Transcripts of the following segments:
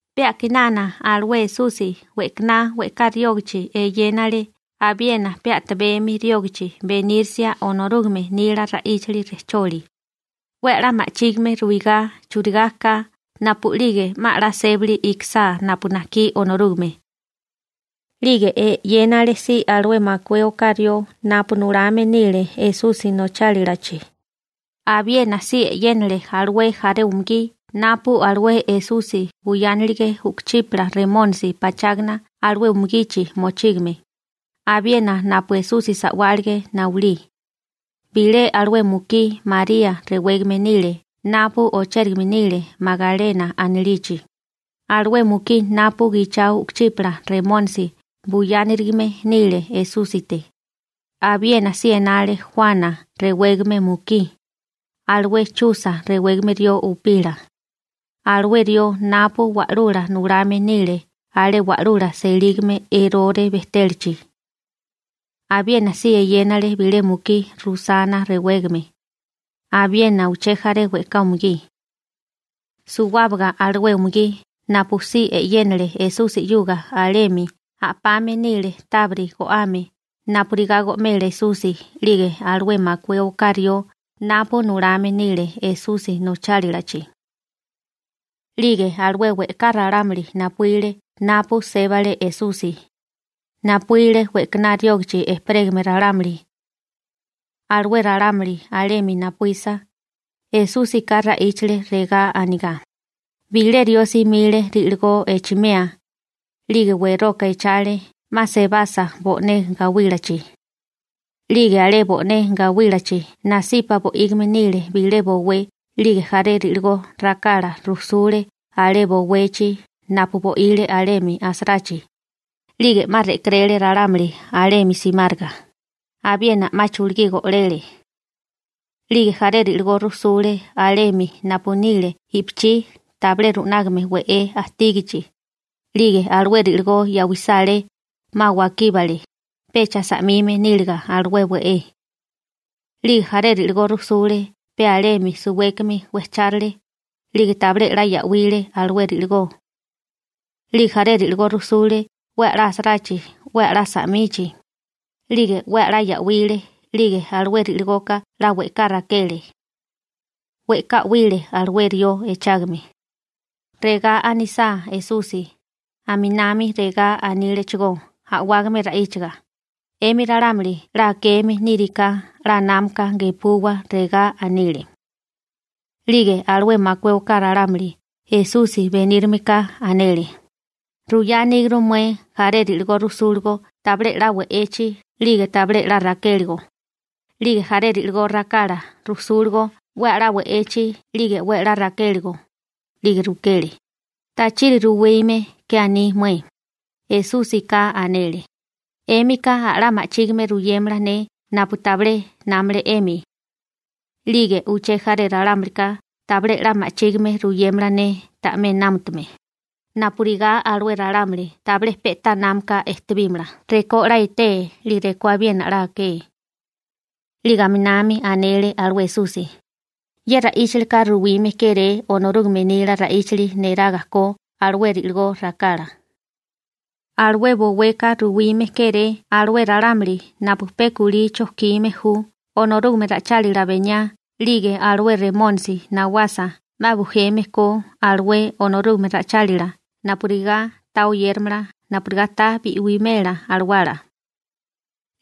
Pe a'kinana alué Esusi we'kaná we'ká riógachi eyénale abiena pe tabemi riógachi benírisia Onorúgame nila ra'íchali rejcholi, 'we a'lá ma'chígime ruigá churigá ka napu'lige 'ma 'la sébali ikisá napu najkí Onorúgame. 'Lige e'yénale si alué makué oká rió napu nulame nile Esusi nochálilachi, abiena si e'yénale alué jaré umugí napu alué Esusi buyánilige u'kuchípala remónisi pachágana alué umugichi mochígame, abiena napu Esusi sa'wálige nayulí. Bilé alué mukí María rewégame nile napu ochérigame nile Magalena anilichi, alué mukí napu gichao u'kuchípala remónisi buyánirigame nile Esúsite. Abiena si enale Juana rewégame mukí, alué Chusa rewégame rió upila, alué rió napu wa'lula nulame nile alé wa'lula selígame Erore bejtélachi. Abiena si eyénale bilé mukí Rusana rewégame, abiena uché jaré we'ká umugí. Suwábaga alué umugí napu si e'yénale Esusi 'yuga alemi a'pame nile tábiri go'ame napurigá go'mela Esusi 'lige alué makué oká rió napu nulame nile Esusi nochálilachi. 'Lige we'ká ralámuli napuíle napu sébale Esusi, napuíle we'kaná riógachi ejperégame ralámuli. Alué ralámuli alemi napuísa, Esúsika ra'íchale, regá anigá: ―Bilé rió simile ri'ligó echimea, 'lige weroka echale 'ma sebasa bo'né gawílachi. 'Lige alé bo'né gawílachi nasipa bo'ígime nile bilé bowé 'lige jaré ri'ligó rakala rujsule alé bowechi napu bo'ile alemi asarachi, 'lige 'ma re'keréle ralámuli alemi simáriga, abiena 'ma chulugí go'lele. 'Lige jaré ri'ligó rujsule alemi napu nile i'pichí tabilé ru'nágame we'é ajtígichi, 'lige alué ri'ligó ya'wisá alé, 'ma wakíbale, pecha sa'mime níliga alué we'é. 'Lige jaré ri'ligó rujsule pe alemi suwékimi wejchárale, 'lige tabilé 'la ya'wile alué ri'ligó. 'Lige jaré ri'ligó rujsule 'we a'lá asarachi 'we a'lá sa'michi, 'lige 'we a'lá ya'wile, 'lige alué ri'ligoka 'la we'ká rakele. We'ká 'wile alué rió echágame. Regá anisá Esusi, aminami regá anílechigó a'wágame ra'íchaga: ―'Emi ralámuli 'la akeme niri ka, 'la námaka gepuwa ―regá anile. 'Lige alué makué oká ralámuli Esusi benírimeka anele: ―Ruyá aníguru mué jaré ri'ligó rujsúligo tabilé 'la we'echi 'lige tabilé 'la rakéligo, 'lige jaré ri'ligó rakala rujsúligo 'we a'lá we'echi 'lige 'we a'lá rakéligo. 'Lige rukele: ―¿Tachiri ruwime ke aní mué? Esúsika anele: ―'Émika a'lá ma'chígime ruyémala ne napu tabilé námale 'emi. 'Lige uché jaré ralámulika tabilé 'la ma'chígime ruyémala ne ta'mé námutame, napurigá alué ralámuli tabilé pe'tá námaka ejtebímala rekó 'la etee 'lige rekó abiena 'la akeé. 'Lige aminami anele alué Esusi: ―Ye ra'íchalika ruwime kéré Onorúgame nila ra'íchali neraga ko alué ri'ligó rakala. Alué boweka ruwime kéré alué ralámuli napu pe kulí chojkime ju Onorúgame ra'ichálila beniá 'lige alué Remónisi nawasa 'ma bujeme ko alué Onorúgame ra'ichálila napurigá ta oyéramala napurigá ta bi'wimela alawala.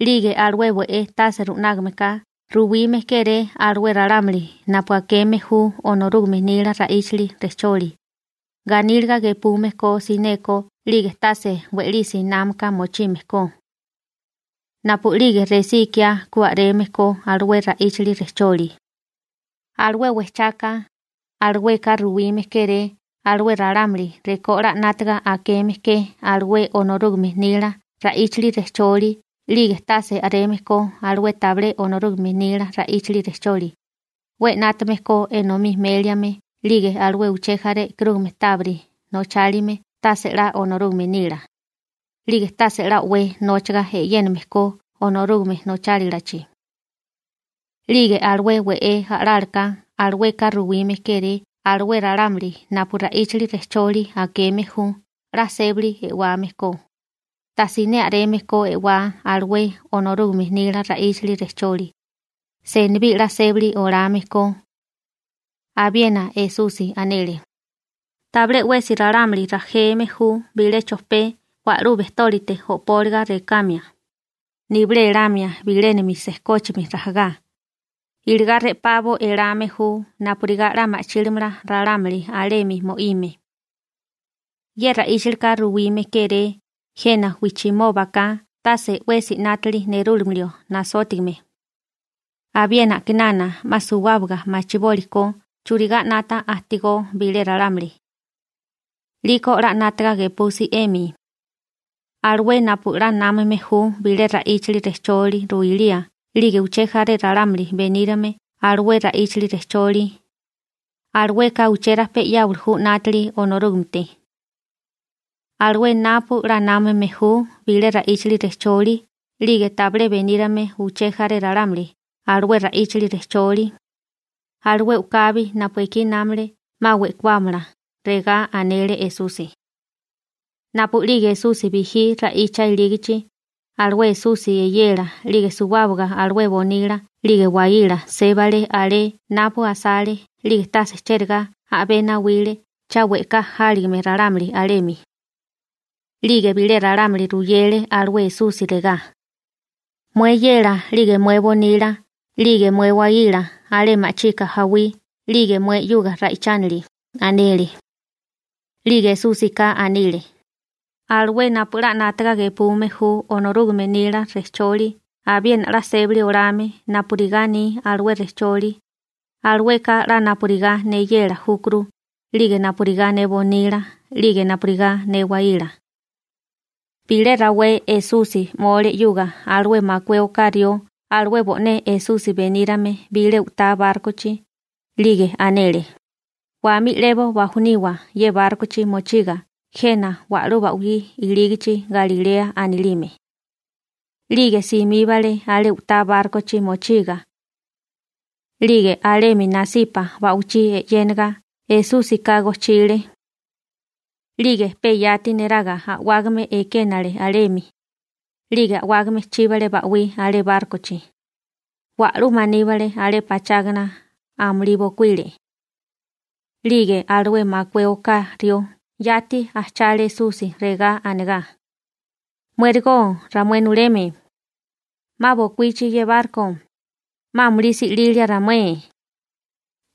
'Lige alué we'é tase ru'nágame ka ruwime kéré alué ralámuli napu akeme ju Onorúgame nila ra'íchali rejcholi, ganíliga gepume ko sineko 'lige tase we'lisi námaka mochime ko. Napu'lige resí ikiá ku a'reme ko alué ra'íchali rejcholi. › Alué wejchaka, alueka ruwime kéré alué ralámuli rekó 'la 'nátaga akeme ke alué Onorúgame nila ra'íchali rejcholi 'lige tase a'reme ko alué tabilé Onorúgame nila ra'íchali rejcholi, 'we 'nátame ko enomí méliame 'lige alué uché jaré e'karúgame tábiri nochálime tase 'la Onorúgame nila, 'lige tase 'la o'wé nóchaga e'yéname ko Onorúgame nochálalachi. 'Lige alué we'é a'lálaká alueka ruwime kéré alué ralámuli napu ra'íchali rejcholi akeme ju 'la sébali e'wame ko, tasiné a'reme ko e'wá alué Onorúgame nila ra'íchali rejcholi, senibí 'la sébali olame ko. Abiena Esusi anele: ―Tabilé 'wesi ralámuli rajeme ju bilé chojpé wa'lú bejtólite o'póliga rekamia, nibilé elamia bilénami sejkóchimi rajagá, iligá re'pabo elame ju napurigá 'la ma'chílimala ralámuli alemi mo'ime. Ye ra'íchalika ruwime kéré jena wijchimóbaka tase 'wesi 'nátili nerúlimio nasótigame, abiena a'kinana 'ma suwábaga machiboli ko churigá 'nata ajtigó bilé ralámuli. 'Liko 'la 'nátaga gepusi 'emi: Alué napu 'la námame ju bile ra'íchali rejcholi ruilía 'lige uché jaré ralámuli benírame alué ra'íchali rejcholi, alueka uchérajpé 'yáwali ju 'nátili Onorúgamete. Alué napu 'la námame ju bilé ra'íchali rejcholi 'lige tabilé benírame uché jaré ralámuli alué ra'íchali rejcholi, alué u'kabi napu ekí námale 'ma we'kuámala ―regá anele Esusi. Napu'lige Esusi bijí ra'icha ilígichi, alué Esusi eyela 'lige suwábaga alué nasípasi bonila 'lige nasípasi waíla sébale alé napu asale 'lige tase cherigá a'bé nawile cha we'ká jáligame ralámuli alemi. 'Lige bilé ralámuli ruyele alué Esusi regá: ―Mué eyela 'lige mué bonila 'lige mué waíla alé ma'chika jawí 'lige mué 'yuga ra'ichánili ―anele. 'Lige Esúsika anile: ―Alué napu 'la 'nátaga gepume ju Onorúgame nila rejcholi abiena 'la sébali olame napurigá aní alué rejcholi, alueka 'la napurigá ne eyela júkuru 'lige napurigá ne bonila 'lige napurigá ne waíla. Bilé rawé Esusi 'mole 'yuga alué makué oká rió alué bo'né Esusi benírame bilé u'tá bárkochi, 'lige anele: ―Wamí 'lebo bajoniwa ye bárkochi mochiga jena wa'lú ba'wí ilígichi Galilea anilime. 'Lige simíbale alé u'tá bárkochi mochiga. 'Lige alemi nasipa ba'wichí e'yénaga Esúsika gojchile. 'Lige pe yati neraga a'wágame ekénale alemi, 'lige a'wágame chíbale ba'wí alé bárkochi, wa'lú maníbale alé pachágana, amulí bokuíle. 'Lige alué makué oká rió yati ajchale Esusi regá anegá: ―¡Muérigo ramué nuleme! ¡'Ma bokuíchi ye barko! ¡'Ma amulí si'lilia ramué!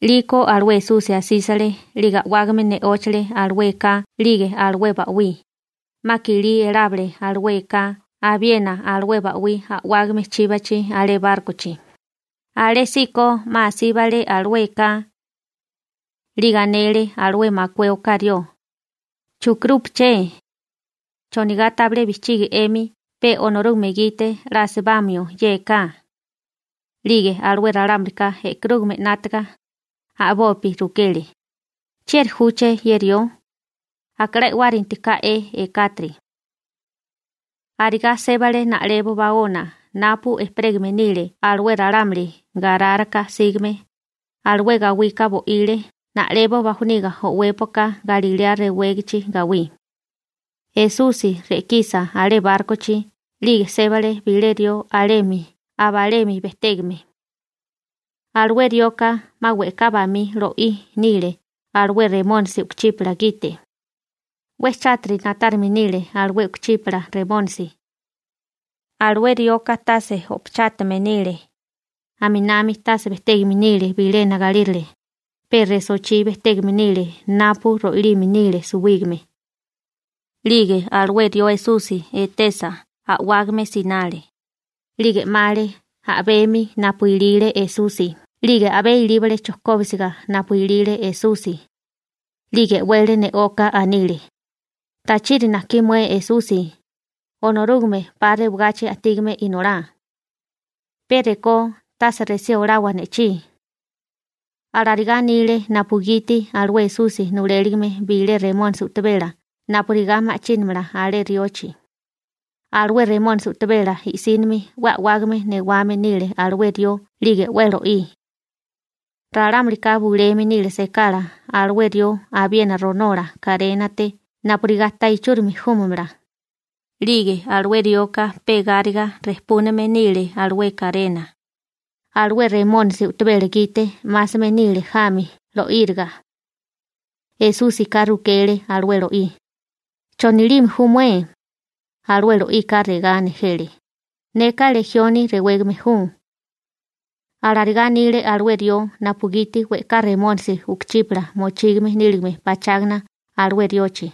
'Liko alué Esusi asísale 'lige a'wágame ne'óchale alué eká 'lige alué ba'wí, 'ma kilí elábale alué eká abiena alué ba'wí a'wágame chíbachi alé bárkochi, alésíko 'ma asíbale alué eká. 'Lige anele alué makué oká rió: ―¿Chukirúpeché? ¿Chonigá tabilé bijchigi 'emi pe Onorúgame gite 'la asibamio ye eká? 'Lige alué ralámulika e'karúgame 'nátaga, a'bopi rukele: ―¿Chieri júché ye rió? Aka 'la e'wárinti ka'e ekátiri. Arigá sébale na'lebo baona napu ejperégame nile alué ralámuli Garáraka sígame, alué gawika bo'ile na'lebo bajoniga o'wépoka Galilea rewégachi gawí. Esusi re'kisa alé bárkochi 'lige sébale bilé rió alemi abalemi bejtégame. Alué rioka 'ma we'ká bamí lo'í nile alué remónisi u'kuchípala gite. 'We chátiri na'tárime nile alué u'kuchípala remónisi. Alué rioka tase o'pachátame nile, aminami tase bejtégame nile bilena galírale, pe resochí bejtégame nile napu ro'ilime nile suwígame. 'Lige alué rió Esusi etesa a'wágame sinale, 'lige 'male a'bemi napu ilile Esusi 'lige a'bé ilíbale chojkóbisiga napu ilile Esusi, 'lige e'wele ne'oka anile: ―¿Tachiri najkí mué Esusi, Onorúgame 'pa rewagachi ajtígame inolá? ¡Pe rekó tase resí olawa ne'chí! Alarigá anile napugiti alué Esusi nuléligime bilé remónisi u'tabela napurigá ma'chínamala alé riochi. Alué remónisi u'tabela i'sínimi 'we a'wágame newame nile alué rió 'lige 'we lo'í. Ralámulika buleme nile sekala alué rió abiena ronola karénate napurigá ta ichúrimi júmamala, 'lige alué rioka pe gáriga rejpúname nile alué karena. Alué remónisi u'tabela gite 'másame nile jami lo'íriga. Esúsika rukele alué lo'í: ―¿Chonilime ju mué? Alué lo'ika regá nejele: ―Neka Lejioni rewégame ju. Alarigá anile alué rió napugiti we'ká remónisi u'kuchípala mochígame níligame pachágana alué riochi.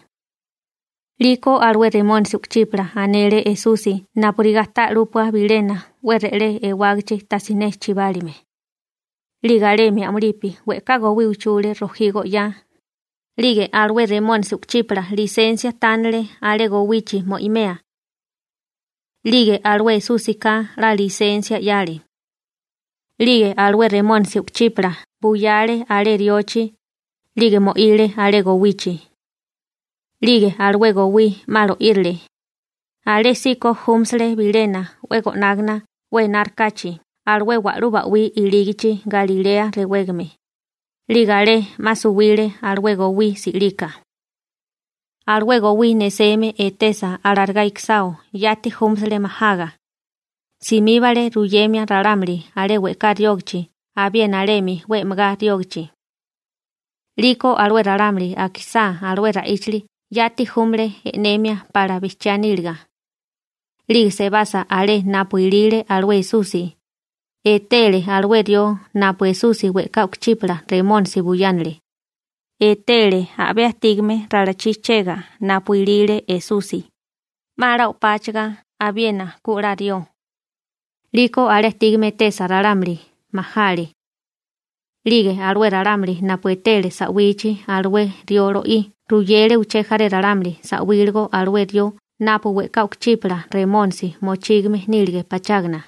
'Liko alué remónisi u'kuchípala anele Esusi napurigá ta 'lúpua bilena 'we re'lé ewágachi tajsiné chibálime. 'Lige alemi a'mulipi we'ká gowí uchule rojí go'yá, 'lige alué remónisi u'kuchípala lisensia tánale alé gowichi mo'imea. 'Lige alué Esúsika 'la lisensia 'yale. 'Lige alué remónisi u'kuchípala buyale alé riochi, 'lige mo'ile alé gowichi. 'Lige alué gowí 'ma lo'írile, alésíko júmasele bilena 'we go'nágana 'we enárikáchi alué wa'lú ba'wí ilígichi Galilea rewégame, 'lige alé 'ma suwile alué gowí si'lika. Alué gowí neseme etesa alarigá ikisao yati júmasele majaga, simíbale ruyemia ralámuli alé we'ká riógachi abiena alemi 'we e'megá riógachi. 'Liko alué ralámuli akisá alué ra'íchali yati júmale e'nemia pala bijchiá níliga. 'Lige sebasa alé napu ilile alué Esusi, etele alué rió napu Esusi we'ká u'kuchípala remónisi buyánale, etele a'bé ajtígame ralachí chega napu ilile Esusi, 'ma 'la o'páchiga abiena ku 'la rió. 'Liko alé ajtígame etesa ralámuli, majale. 'Lige alué ralámuli napu etele sa'wichi alué rió lo'í ruyele uché jaré ralámuli sa'wíligo alué rió napu we'ká u'kuchípala remónisi mochígame nílige pachágana.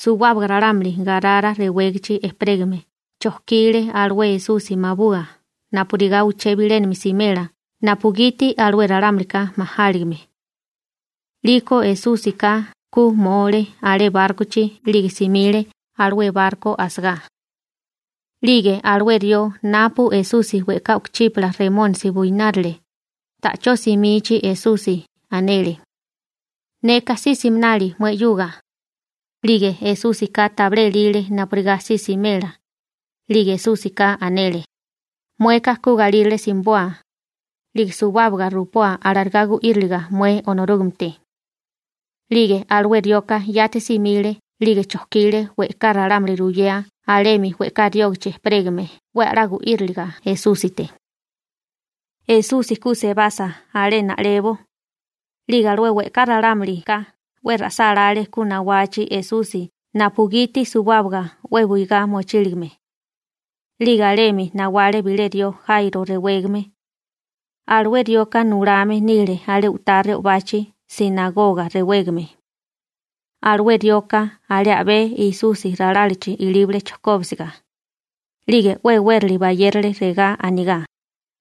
Suwábaga ralámuli Garara rewégachi ejperégame chojkile alué Esusi mabua napurigá uché bilénami simela napugiti alué ralámulika majáligime. 'Liko Esúsika ku 'mole alé bárkochi 'lige simile alué barko asagá. 'Lige alué rió napu Esusi we'ká u'kuchípala remónisi buyánirile, ta'chó simichi Esusi, anele: ―Neka si siminali mué 'yuga. 'Lige Esúsika tabilé elile napurigá si simela, 'lige Esúsika anele: ―Mueka ku galírale simiboa, 'lige suwábaga rupoa alarigá gu'íriliriga mué Onorúgamete. 'Lige alué rioka yati simile 'lige chojkile we'ká ralámuli ruyea alemi we'ká riógachi ejperégame 'we a'lá gu'íriliga Esúsite. Esusi ku sebasa alé na'lebo, 'lige alué we'ká ralámulika 'we ra'sálále ku nawachi Esusi napugiti suwábaga 'we buigá mochíligame. 'Lige alemi nawale bilé rió Jairo rewégame. Alué rioka nulame nile alé u'tá re'obachi «sinagoga» rewégame. Alué rioka alé a'bé Esusi ralálachi ilíbale chojkóbisiga, 'lige 'we e'wérali bayérale regá anigá: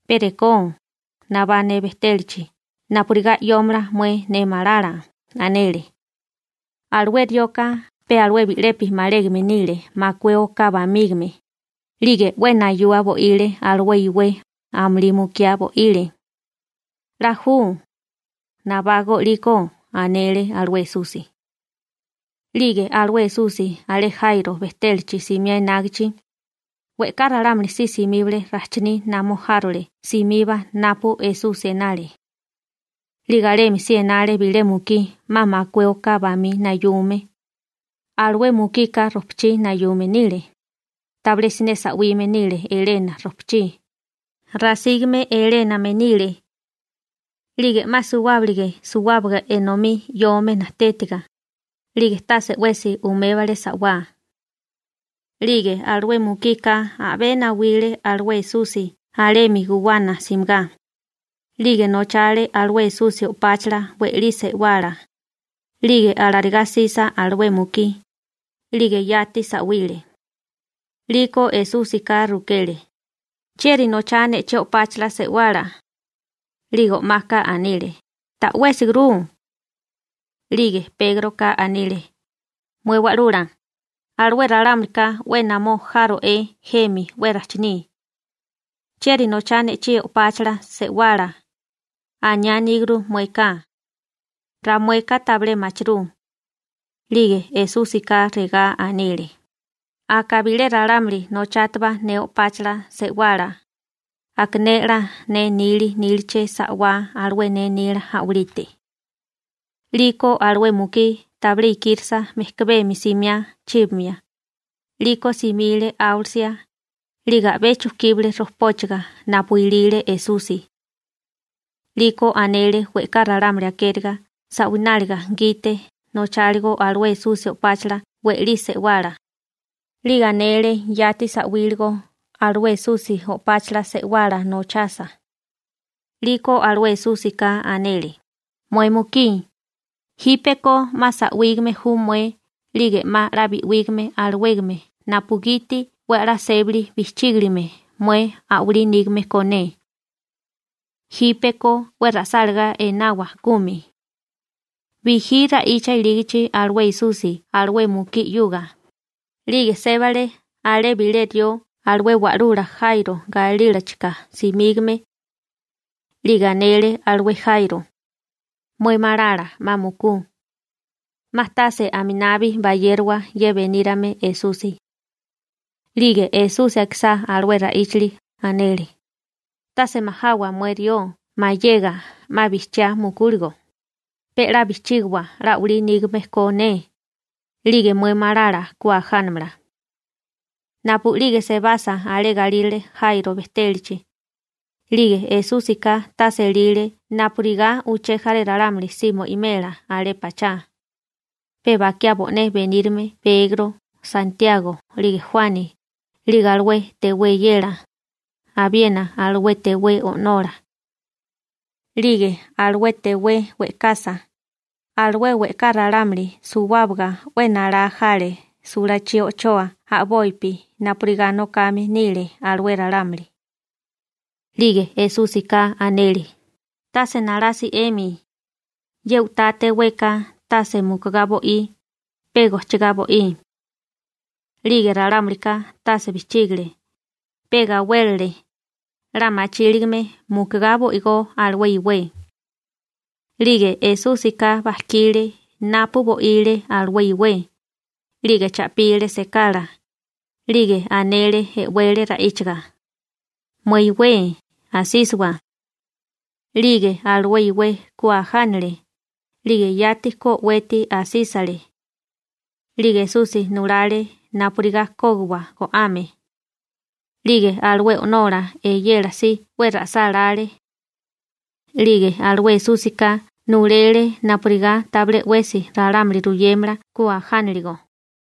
―Pe rekó, nabá ne bejtélachi napurigá 'yómala mué ne malala ―anele. Alué rioka pe alué bi'lepi malégame nile makué oká bamígame, 'lige 'we nayua bo'ile alué iwé, amulí mukiá bo'ile. ―'La ju. Nabágó 'líkó ―anele alué Esusi. 'Lige alué Esusi alé Jairo bejtélachi simiá enágichi, we'ká ralámuli si simíbale rajchiní namó járole simiba napu Esusi enale. 'Lige alemi si enale bilé mukí 'ma makué oká bamí nayume, alué mukika rojpachí nayume nile, tabilé siné sa'wime nile elena rojpachí, rasígame eléname nile. 'Lige 'ma suwábalige suwábaga enomí 'yome najtétiga, 'lige tase 'wesi umébale sa'wá. 'Lige alué mukika a'bé nawile alué Esusi alemi guwana simigá, 'lige nochale alué Esusi o'páchala we'lí se'wala, 'lige alarigá 'sisa alué mukí, 'lige yati sa'wile. 'Liko Esúsika rukele: ―¿Chieri nochá ne'chí o'páchala se'wala? 'Lige o'maka anile: ―Ta'wésigurú. 'Lige Pégroka anile: ―Mué Wa'lula, alué ralámulika 'we namó járo'é jemi 'we rajchiní. «¿Chieri nochá ne'chí o'páchala se'wala?», aniá aníguru mueka. Ramueka tabilé machirú. 'Lige Esúsika regá anile: ―Aka bilé ralámuli nochátubá ne o'páchala se'wala, aka ne 'la ne nili níliché sa'wá alué ne nila a'walite. 'Liko alué mukí tabilé ikírisa mejkabemi simiá chíbamia, 'liko simile áwalisia, 'lige a'bé chujkíbale rojpóchaga napu ilile Esusi. 'Liko anele we'ká ralámuli akériga sa'wináliga gite nocháligo alué Esusi o'páchala we'lí se'wala, 'lige anele yati sa'wíligo alué Esusi o'páchala se'wala nochasa. 'Liko alué Esúsika anele: ―Mué mukí, jípeko 'ma sa'wígame ju mué 'lige 'ma 'la bi'wígame alawégame napugiti 'we a'lá sébali bijchígiligame mué a'walí nígame ko ne. Jípeko 'we ra'sálagá enawa kumi. Bijí ra'icha ilígichi alué Esusi alué mukí 'yuga, 'lige sébale alé bilé rió alué wa'lula Jairo galílachika simígame. 'Lige anele alué Jairo: ―Mué malala 'ma mukú. 'Ma tase aminabi bayérowa ye benírame Esusi. 'Lige Esusi akisá alué ra'íchali, anele: ―Tase majawa mué rió mayega 'ma bijchiá mukúligo, pe 'la bijchígiwa 'la a'walí nígame ko ne, 'lige mué malala ku ajánamala. Napu'lige sebasa alé galírale Jairo bejtélachi, 'lige Esúsika tase elile napurigá uché jaré ralámuli si mo'imela alé pachá, pe bakiá bo'né benírime Pegro, Santiago, 'lige Juani, 'lige alué tewé eyela, abiena alué tewé o'nola. 'Lige alué tewé we'kasa, alué we'ká ralámuli suwábaga 'we nalá jale sulachí o'choa a'bopi napurigá nokame nile alué ralámuli. 'Lige Esúsika anele: ―Tase nalasi 'emi. Ye u'tá teweka tase mukugá bo'í, pe gojchigá bo'í. 'Lige ralámulika tase bijchígile, pe gawélele, 'la machíligame mukugá bo'igó alué iwé. 'Lige Esúsika bajkile napu bo'ile alué iwé, 'lige cha'pile sekala, 'lige anele e'wele ra'íchaga: ―¡Mué iwé, asísiwa! 'Lige alué iwé ku ajánale, 'lige yati ku o'weti asísale. 'Lige Esusi nulale napurigá kógiwa go'ame. 'Lige alué o'nola eyela si 'we ra'sálále. 'Lige alué Esúsika nulele napurigá tabilé 'wesi ralámuli ruyémala ku ajánilirigo.